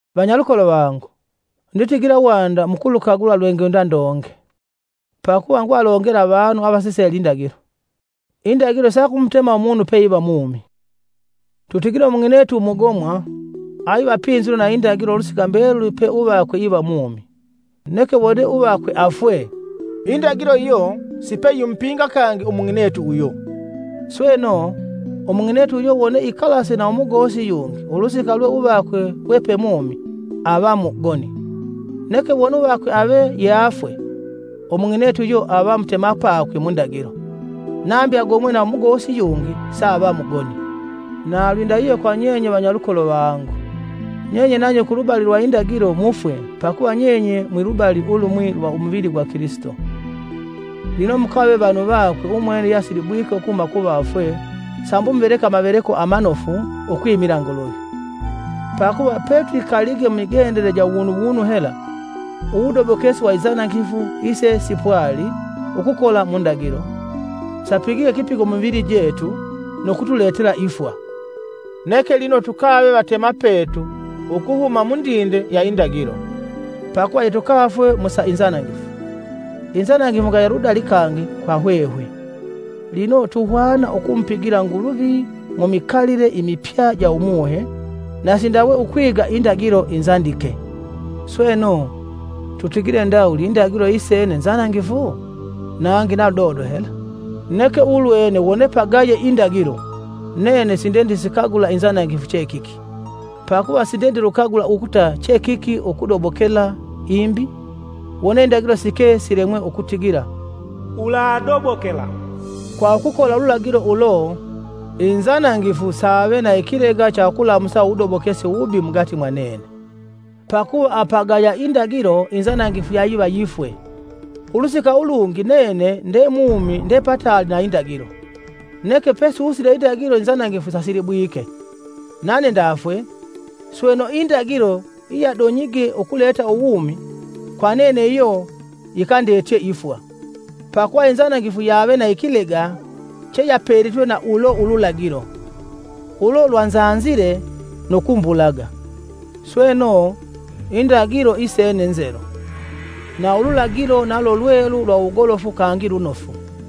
Vanyalukolo vangu, nditigila wanda mukulukagula lwengwenda ndonge, pakuva nguvalongela avanu avasisele indagilo. Indagilo sakumutema umunu peiva mumi. Tutigile umung'inetu umugomwa, aiva apinzilwe na indagilo ulusika mbeluli pe uvakwe iva mumi, neke wone uvakwe afwe, indagilo iyo sipeyimupinga kangi umung'inetu uyo. Sweno, umung'inetu uyo wone ikalase na umugosi yungi ulusika lwe uvakwe we pe mumi, ava mugoni, neke wone uvakwe ave yeafwe, umung'inetu uyo ava mutemapakwe mu ndagilo, nambi agomwe na umugosi yungi saava mugoni. Na lwindahihyo kwa nyenye vanyalukolo vangu, nyenye nanye kulubali lwa indagilo mufwe pakuva nyenye mwilubali ulumwi lwa umuvili gwa Kilisito; lino mukave vanu vakwe umwene yeasilibwike ukuhuma kuvafwe sambi muveleke amaveleko amanofu ukwimila Nguluvi. Pakuva, pe twikalige mumigendele ja uwunuwunu hela, uwudobokesi wa inzanangifu ise sipwali ukukola mu ndagilo, sapigige ikipigo mu mivili jetu nu kutuletela ifwa. Neke lino tukave vatemapetu ukuhuma mundinde ya indagilo, pakuva yetukafwe mu sa inzanangifu, inzanangifu ingaya ludali kangi kwa hwehwe, lino tuhwana ukumupigila Nguluvi mu mikalile imipya ja Umuhe, na si ndawe ukwiga indagilo inzandike. Sweno, tutigile ndawuli indagilo isene nzanangifu? Nangi na ludodo hela! Neke ulwene wone pagaye indagilo, nene sindendisikagula inzanangifu che kiki. Pakuva sindendilukagula ukuta che kiki ukudobokela imbi, wone indagilo sike silemwe ukutigila, “Uladobokela.” Kwa ukukola ululagilo ulo, inzanangifu save na ikilega cha ukulamusa uwudobokesi uwubi mugati mwanene. Pakuva apagaya indagilo inzanangifu yayiva yifwe. Ulusika ulungi nene nde mumi nde pataali na indagilo, neke pesusile indagilo inzanangifu sasilibwike, nane ndafwe, sweno indagilo iyadonyige ukuleta uwumi, kwa nene iyo yikandetye ifwa. Pakuva inzanangifu yave na ikilega cheyapelitwe na ulo ululagilo, ulo lwanzanzile nu kumbulaga. Sweno, indagilo isene nzelu, na ululagilo nalo lwelu lwa wugolofu kangi lunofu.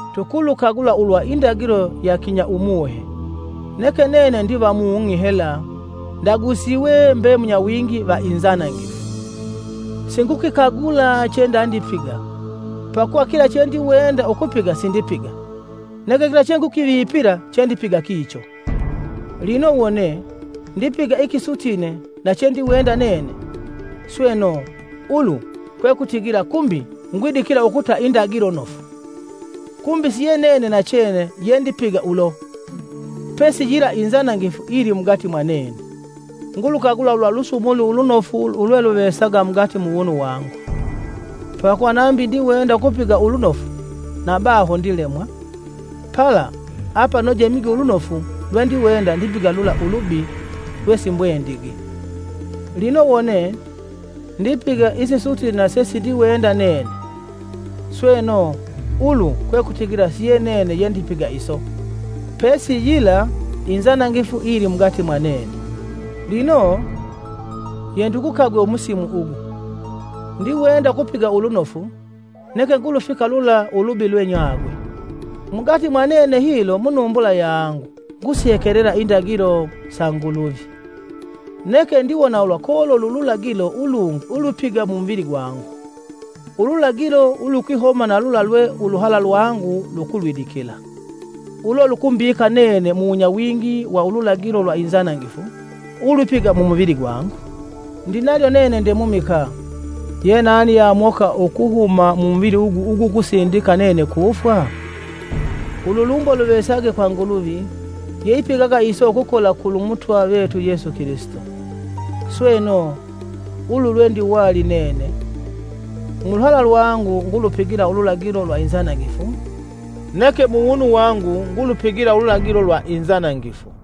Tukulukagula ulwa indagilo ya kinya umuhe; neke nene ndivamung'i hela ndagusiwe mbe munyawingi va inzanangifu. Singukikagula chendandipiga, pakuva kila chendiwenda ukupiga sindipiga, neke kila chengukivipila chendipiga kicho. Lino wone, ndipiga ikisutine na chendiwenda nene, sweno ulu kwekutigila kumbi ngwidikila ukuta indagilo nofu. Kumbi si yenene nachene yendipiga ulo, pesi yila inzanangifu iyilimugati mwanene. Ngulukagula ulwa lusumuli ulunofu ulweluvesaga mugati muwunu wangu. Pakuva nambi ndiwenda ukupiga ulunofu, na baho ndilemwa. Pala, apanoje mige ulunofu lwendiwenda, ndipiga lula ulubi lwesimbwendigi. Lino wone, ndipiga isisutine na sesindiwenda nene, sweno ulu kwekutigila si yenene yendipiga iso, pesi sila inzanangifu iyilimugati mwanene. Lino, yendigukagwe umusimu ugu; ndiwenda ukupiga ulunofu, neke ngulufika lula ulubi lwenyagwe. Mugati mwanene hilo munumbula yangu ngusihekelela indagilo sa Nguluvi. Neke ndiwona ulwa kololi ululagilo ulungi ulwipiga mu muvili gwangu, ululagilo ulukwihoma na lula lwe uluhala lwangu lukulwidikila. Ulo lukumbika nene muwunyawingi wa ululagilo lwa inzanangifu ulwipiga mumuvili gwangu. Ndinalyo nene ndemumikaa! Yenani ye amoka ukuhuma mumuvili ugu ugukusindika nene kufwa? Ululumbo luvesage kwa Nguluvi, yeipigaga iso ukukola kulu Mutwa vetu Yesu Kilisito! Sweno, ulu lwendiwali nene; mu luhala lwangu ngulupigila ululagilo lwa inzanangifu neke mu wunu wangu ngulupigila ululagilo lwa inzanangifu.